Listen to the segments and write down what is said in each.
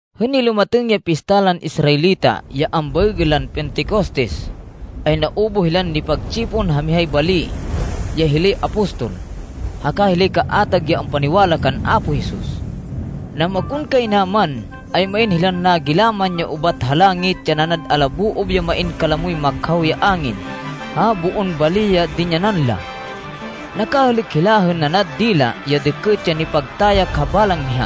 Hên nilumatêng ya pista lan Israelita ya ambaêgên lan Pentecostes, ay naubuh hilan nipagtsipon ha mihay bali ya hilay apostol, haka hilay kaatag ya ampaniwala kan Apo Jesus. Namakonkaynaman ay main hilan nagilaman ya ubat ha langit ya nanad alaboob ya main kalamoy makhaw ya angin ha boon bali ya dinyanan la. Nakahêlêk hila hên nanad dila ya dêkêt ya nipagtayak ha balang miha.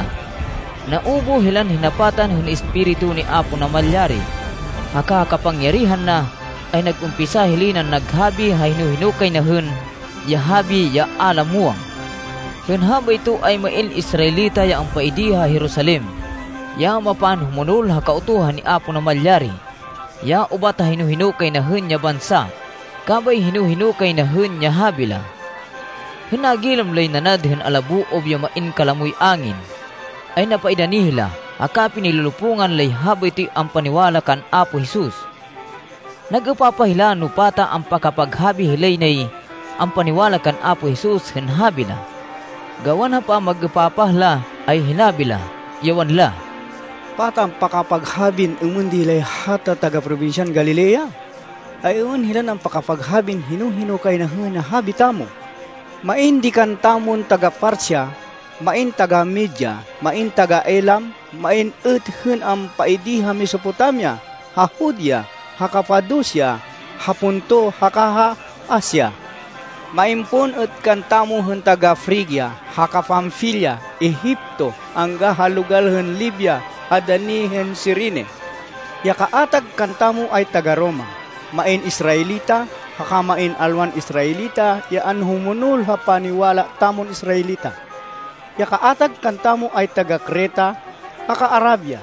Naubuh hilan hinapatan hên Espiritu ni Apo Namalyari, haka ha kapangyarihan na ay nag-umpisa hilay nan naghabi ha hino-hino kay na hên ya habi ya a la muwang. Hên habayto, ay main Israelita ya ampaidi ha Jerusalem, ya mapanhumonol ha Kautuhan ni Apo Namalyari, ya ubat ha hino kay na hên ya bansa, kabay hino-hino kay na hên ya habi la. Hên nagilam lay nanad hên alaboob ya main kalamoy angin, ay napaidani hila, haka pinilolopungan lay habaytoy ampaniwala kan Apo Jesus. Nag-êpapah hila no pata ampakapaghabi hilay nay ampaniwala kan Apo Jesus hên habi la. Gawan ha pamag-êpapah la ay hinabi la, ya wanla, “Pata ampakapaghabin êmên di hilay hata taga-probinsyan Galilea! Ay êmên hilan ampakapaghabin hino-hino kay na hên habi tamo? Main di kantamon taga-Partia, main taga-Media, main taga-Elam, main êt hên ampaidi ha Mesopotamia, ha Judea, ha Capadocia, ha Ponto, haka ha Asia. Main pon êt kantamo hên taga-Frigia haka Panfilia, Egipto, angga ha logal hên Libia ha dani hên Cirene. Ya kaatag kantamo ay taga-Roma, main Israelita, haka main alwan Israelita ya anhumonol ha paniwala tamon Israelita. Ya kaatag kantamo ay taga-Creta haka Arabia.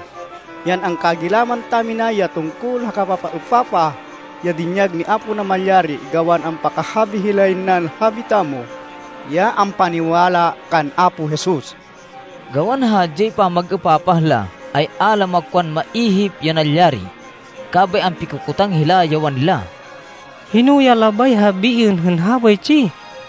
Yan angkagilaman tamina ya tungkol ha kapapaêpapah ya dinyag ni Apo Namalyari gawan ampakahabi hilay nan habi tamo, ya ampaniwala kan Apo Jesus.” Gawan ha hadyay pamag-êpapah la, ay a la makwan maihip ya nalyari. Kabay ampikokotang hila ya wanla, “Hino ya labay habiên hên habaytsi?”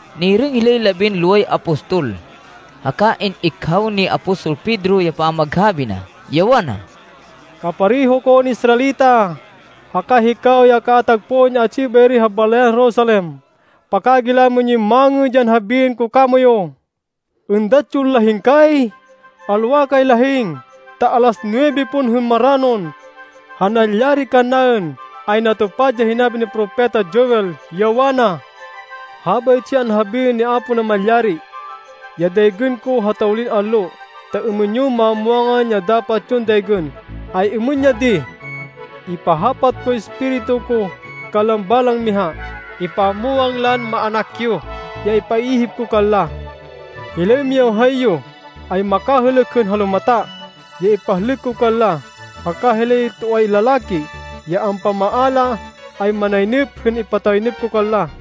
Nirêng hilay labinloway apostol, haka in-ikhaw ni apostol Pedro ya pamaghabi na ya wana, “Kapareho kon Israelita, haka hikaw ya kaatag pon ya atsi bayri ha balayan Jerusalem. Pakagilamên yon mangêd ya habiên ko kamoyu. Êndat yon lahing kay. Alwa kay lahing, ta alas nuwebe pon hên maranon. Ha nalyari kannaên, ay natupad ya hinabi ni Propeta Joel, ya wana, ‘Habaytsi ya anhabiên ni Apo Namalyari. Ya daygên ko ha tawlin allo, ta êmên yo mamwangan ya dapat yon daygên, ay êmên ya di. Ipahapat koy Espiritu ko kanlan balang miha. Ipamwang lan maának yo ya ipaihip ko kanla. Hilay miyawhay yo ay makahêlêk hên halumata, ya ipahlêk ko kanla haka hilay toay lalaki ya ampamaala ay manaynêp hên ipataynêp ko kanla.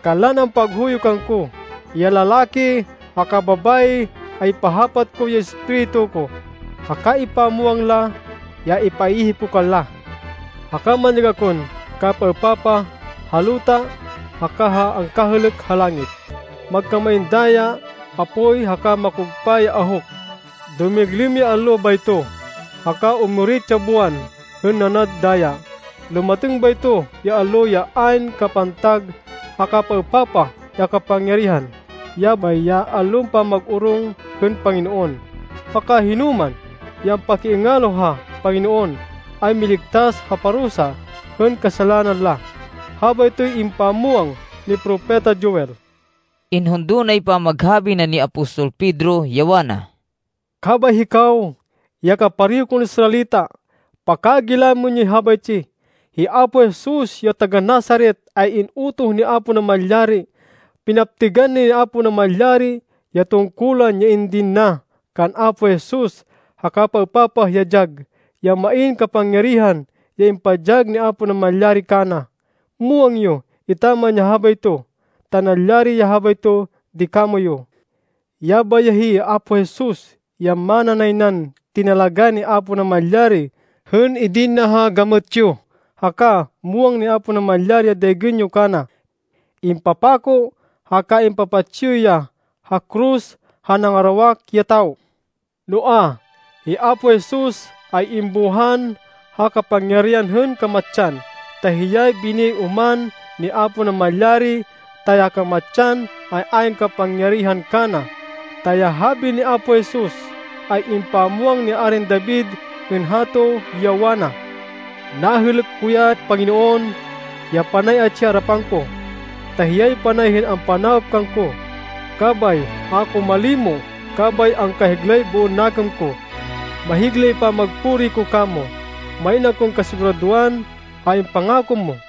Kanlan ampaghuyo kangko, ya lalaki haka babayi, ay ipahapat ko ya Espiritu ko, haka ipamwang la ya ipaihip ko kanla. Haka manyag akon kapapaêpapah ha luta haka ha angkahêlêk ha langit. Magkamain daya, apoy, haka makugpa ya ahuk. Dumiglêm ya allo bayto, haka umurit ya buwan hên nanad daya. Lumatêng bayto ya allo, ya ayn kapantag ha kapapaêpapah ya kapangyarihan, yabay ya allon pamag-orong hên Panginoon. Haka hinoman ya ampakiingalo ha Panginoon ay miligtas ha parusa hên kasalanan la.’ Habaytoy impamwang ni Propeta Joel.” Inhundo nay pamaghabi na ni apostol Pedro, ya wana, “Kabay hikaw ya kapareho kon Israelita, pakagilamên yoy habaytsi! Hi Apo Jesus ya taga-Nazaret ay in-utoh ni Apo Namalyari. Pinaptêgan ni Apo Namalyari ya tungkulan ya indin na kan Apo Jesus ha kapapaêpapah ya dyag, ya main kapangyarihan ya impadyag ni Apo Namalyari kana. Muwang yo etaman ya habayto, ta nalyari ya habayto di kamoyu. Yabay ya hi Apo Jesus ya mana nay nan tinalagá ni Apo Namalyari hên idin na ha gamêt yo, haka muwang ni Apo Namalyari ya daygên yo kana. Impapako haka impapatsi yo ya ha koros ha nangarawak ya tawo. Noa, hi Apo Jesus ay imbuhan ha kapangyarihan hên kamatsan ta hiyay biniyay oman ni Apo Namalyari, ta ya kamatsan ay ayn kapangyarihan kana. Ta ya habi ni Apo Jesus ay impamwang ni Arin David hên hato, ya wana, ‘Nahêlêk ko ya Panginoon ya panay atsi ha arapan ko, ta hiyay panay hên ampanawop kangko, kabay a ko malimo. Kabay angkahiglay boon nakêm ko. Mahiglay pamagpuri ko kamo. Main akon kasiguradoan ha impangako mo,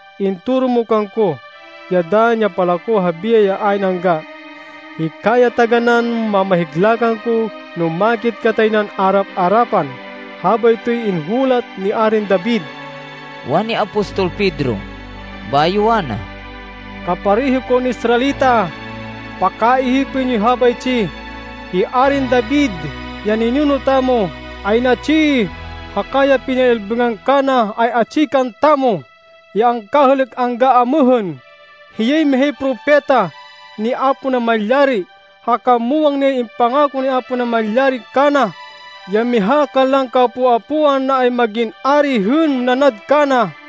Intoro mo kangko ya dann ya palako ha biyay ya ayn angga. Hika ya taganán mamahigla kangko no makit katay nan arap-arapan.’ Habaytoy inhulat ni Arin David.” wani apostol Pedro. Bayo wana, “Kapareho kon Israelita, pakaihipên yoy habaytsi. Hi Arin David, ya ninuno tamo ay natsi, haka ya pinay-ilbêngan kana ay atsi kantamo, ya angkahêlêk angga amêhên. Hiyay mihay propeta ni Apo Namalyari, haka muwang nay impangako ni Apo Namalyari kana, ya miha kanlan kaapo-apoan na ay mag-in ari hên nanad kana.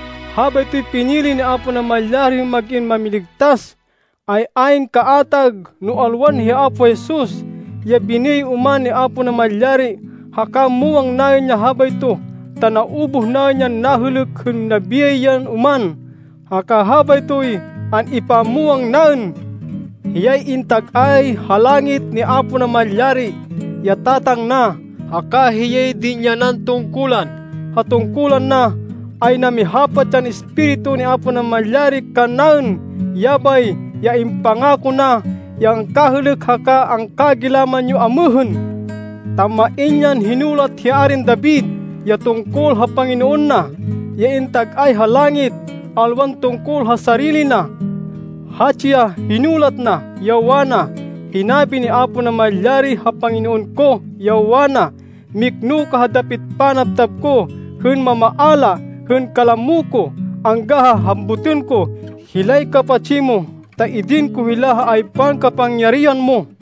Habaytoy pinili ni Apo Namalyari hên mag-in Mámiligtas, ay ayn kaatag no alwan hi Apo Jesus, ya biniyay oman ni Apo Namalyari. Haka muwang naên ya habayto, ta naubuh naên yan nahêlêk hên nabiyay yan oman, haka habaytoy an-ipamwang naên. Hiyay intag-ay ha langit ni Apo Namalyari, ya Tatang na, haka hiyay dinyanan tungkulan. Ha tungkulan na, ay namihapat yan Espiritu ni Apo Namalyari kannaên. Yabay ya impangako na, ya angkahêlêk haka angkagilaman yo amêhên. Ta main yan hinulat hi Arin David ya tungkol ha Panginoon na, ya intag-ay ha langit, alwan tungkol ha sarili na. Hatsi ya hinulat na, ya wana, ‘Hinabi ni Apo Namalyari ha Panginoon ko, ya wana, “Mikno ka ha dapit panabtab ko hên mamaala hên kalamo ko, angga ha hambutên ko hilay kapatsi mo, ta idin ko hila ha aypan kapangyarihan mo.”’”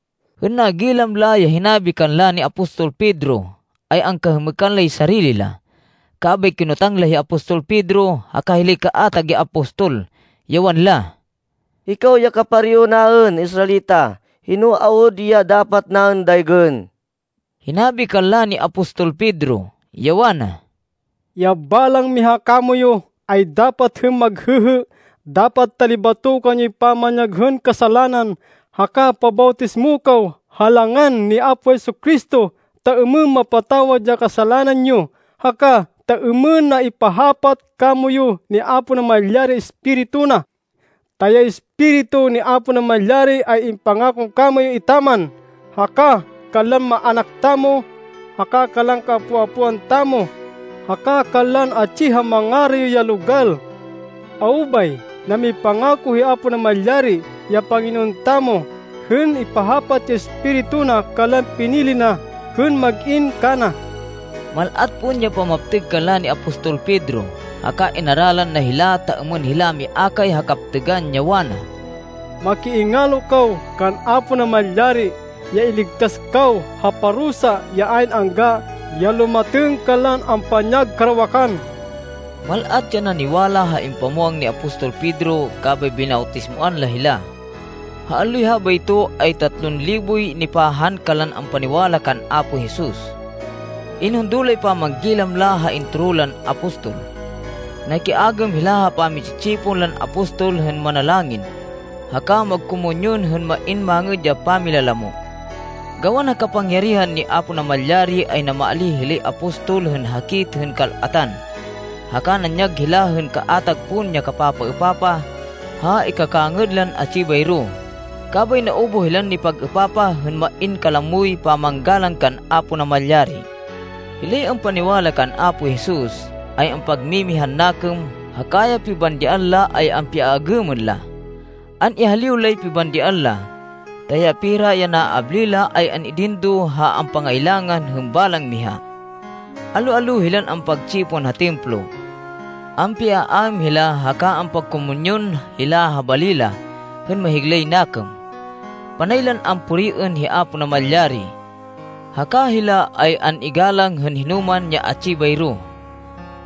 Hên nagilam la ya hinabi kanla ni apostol Pedro, ay angkahêmêkan lay sarili la. Kabay kinotang la hi apostol Pedro haka hilay kaatag ya apostol, ya wanla, “Hikaw ya kapareho naên Israelita, hino awud ya dapat naên daygên?” Hinabi kanla ni apostol Pedro, ya wana, “Ya balang miha kamoyu, ay dapat hên maghêhê. Dapat talibatokan yoy pamanyag hên kasalanan, haka pabawtismo kaw ha langan ni Apo Jesu-Cristo, ta êmên mapatawad ya kasalanan yo, haka ta êmên na ipahapat kamoyu ni Apo Namalyari ya Espiritu na. Ta ya Espiritu ni Apo Namalyari ay impangako kamoyu etaman, haka kanlan maának tamo, haka kanlan kaapo-apoan tamo, haka kanlan atsi ha mangarayo ya logal. Awo bay, namipangako hi Apo Namalyari, ya Panginoon tamo, hên ipahapat ya Espiritu na kanlan pinili na, hên mag-in kana.” Mal-at pon ya pamaptêg kanla ni apostol Pedro, haka inaralan na hila, ta êmên hila miakay ha kaptêgan, ya wana, “Makiingalo kaw kan Apo Namalyari, ya iligtas kaw ha parusa ya ayn angga ya lumatêng kanlan ampanyag karawakan!” Mal-at ya naniwala ha impamwang ni apostol Pedro kabay binawtismoan la hila. Ha alloy habayto ay tatlon liboy nipahan kanlan ampaniwala kan Apo Jesus. Inhundo lay pamanggilam la ha intoro lan apostol. Nakiagêm hila ha pami-tsi-tsipon lan apostol hên manalangin, haka magkomunyon hên main mangêd ya pamilalamo. Gawan ha kapangyarihan ni Apo Namalyari, ay namaalíh hilay apostol hên hakit hên kal-atan, haka nanyag hila hên kaatag pon ya kapapaêpapah ha ikakangêd lan atsi bayro, kabay naubuh hilan nipag-êpapah, hên main kalamoy pamanggalang kan Apo Namalyari. Hilay ampaniwala kan Apo Jesus, ay ampagmimihan nakêm haka ya pibandian la ay ampiaagêmên la. An-ihaliw lay pibandian la, ta ya pera ya naabli la ay an-idin do ha ampangailangan hên balang miha. Allo-allo hilan ampagtsipon ha Templo. Ampiaaêm hila haka ampagkomunyon hila ha bali la hên mahiglay nakêm. Panay lan ampuriên hi Apo Namalyari. Haka hila ay an-igalang hên hinoman ya atsi bayro.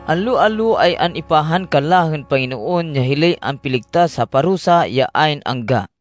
Allo-allo ay an-ipahan kanla hên Panginoon ya hilay ampiligtas ha parusa ya ayn angga.